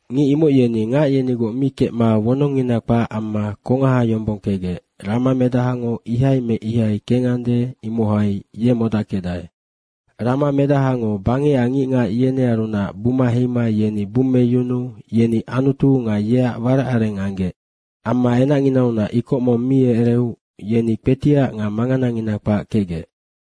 Ngic imoc yeni ngac yenigoc mi kecma wonongngina kpac amma kongaha yombong kecgec ramamedahango ihai me ihai kengande, imohai ye modackecdae. Ramamedahango bangecac ngicngac yenearunac buma heima yeni bummeyunuu yeni Anutu nga yeac waracareng anggec. Amma enacnginaunac ikoc mong mi ereu yeni kpetiac nga manganangina kpac kecgec.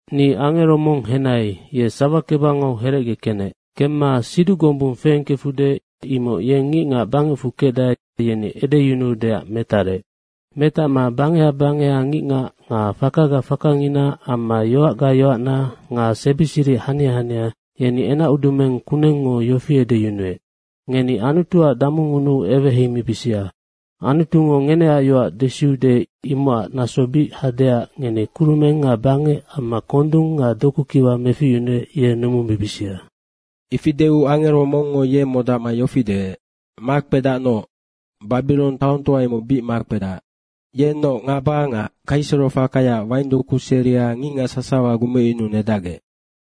Ni angero mong henai, ye sawakebangau herecge kenec. Kemma siduc gombung feengkefude, imoc yeng ngicngac bangecfu kecdae, yeni edeyunuudeac metarec. Metacma bangeha bangeha ngicngac nga fakaga fakangina amma yoacga yoacna nga sebi siric hania hania, yeni enacudumeng kunengngo yofi deec, “Ngeni Anutuac damungunuu eweheimibisia. Anutungo ngeneac yoac desiude imocac naso bic hadeac ngeni kurumeng nga bangec amma kondung nga dokukiwa meficyunuec, ye numumibisia.” Ifi deu angero mongngo ye modacma yofi deec, “Makpedacnoc, Babirong taongtoa imoc bic makpedac. Yennoc ngaba nga kaiserofakayaac waindoku seria ngicngac sasawa gumecyunuu nedacgec.”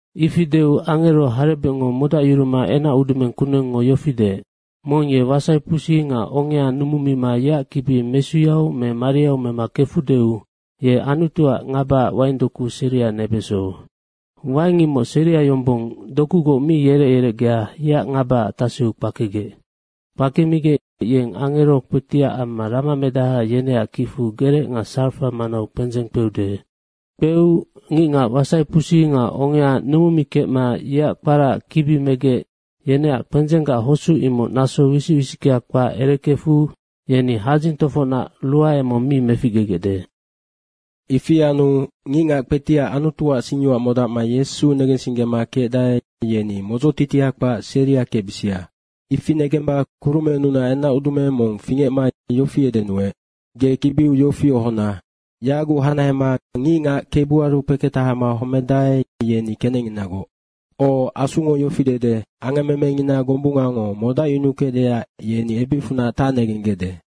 Ifi deu angero harebecngo modacyuruma enacudumeng kunengngo yofi deec, “Mong ye wasaipusi nga ongea numumima yeac kibi mesuyau me mariau mema mekefudeu ye Anutuac ngabaac waindoku seria nebeso. Waing imoc seria yombong dokugoc mi yerec yerecgea yeac ngabaac taseu kpakegec. Kpakemigec, yeng angero kpetiac amma ramamedaha, yeneac kicfu gerec nga sarafa manau kpendzeng kpeude. Kpeu ngicngac wasaipusi nga ongea numumikecma yeac kparaac kibi megec, yeneac kpendzenggac hosuc imoc naso wisic wisickea kpac erekefu yeni hadzing tofocnac ruae mong mi meficgegecde. Ifi anu ngicngac kpetiac Anutuac singyoac modacma Yesu negensinggema kecdae, yeni modzotitia kpac seria kecbisia.” Ifi negemba kurumennunac enacudumeng mong fingecma yofi edenuec, “Ge kibiu yofi ohona, ‘Yaguc hanahema ngicngac Kebuaru kpeketahama homedae, yeni kenecnginagoc. O, Asungo yofi dede, angammemengina gombungango modacyunukecdeac yeni ebicfunac tacnegenggecde.’”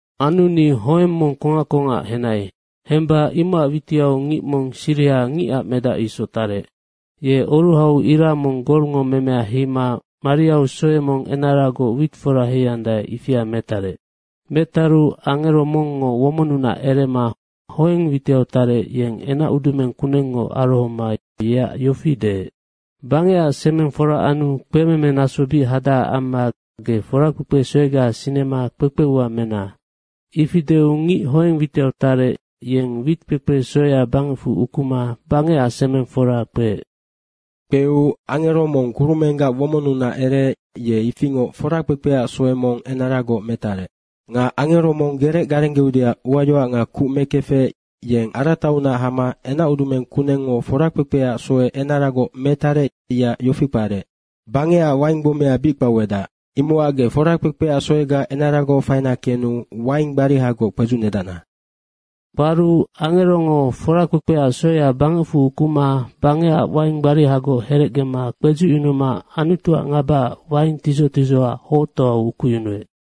Anu ni hoeng mong kongac kongac henai. Hemba imocac witiau ngic mong siriha ngicac medac isoc tarec. Ye oruhau ira mong golngo memea heima mariau soe mong enaragoc wit fora heiandae, ifia metarec. Metaru angero mongngo womonnunac erema hoeng witiau tarec, yeng enacudumeng kunengngo arohoma yeac yofi deec, “Bangecac semeng fora anu kpememenaso bic hadacac amma ge forakpekpe soega sinema kpekpe ua mena.” Ifi deu ngic hoeng witiau tarec, yeng witkpekpe soea bangecfu ukuma bangecac semeng fora kpeec. Kpeu angero mong kurumenggac womonnunac ereec, ye ifingoc forakpekpeac soe mong enaragoc metarec. Nga angero mong gerec garenggeudeac uayoac nga kuc mekefec, yeng arataunac hama enacudumeng kunengngo forakpekpeac soe enaragoc metarec, yeac yofi kparec, “Bangecac waing gbomea bic kpauedac. Imocac ge forakpekpeac soega enaragoc faina kenu waing gbarihagoc kpedzucnedacna.” Kparu angerongo forakpekpeac soea bangecfu ukuma bangecac waing gbarihagoc herecgema kpedzucyunuma Anutuac ngabaac waing tidzoc tidzohoac hoctoau ukuyunuec.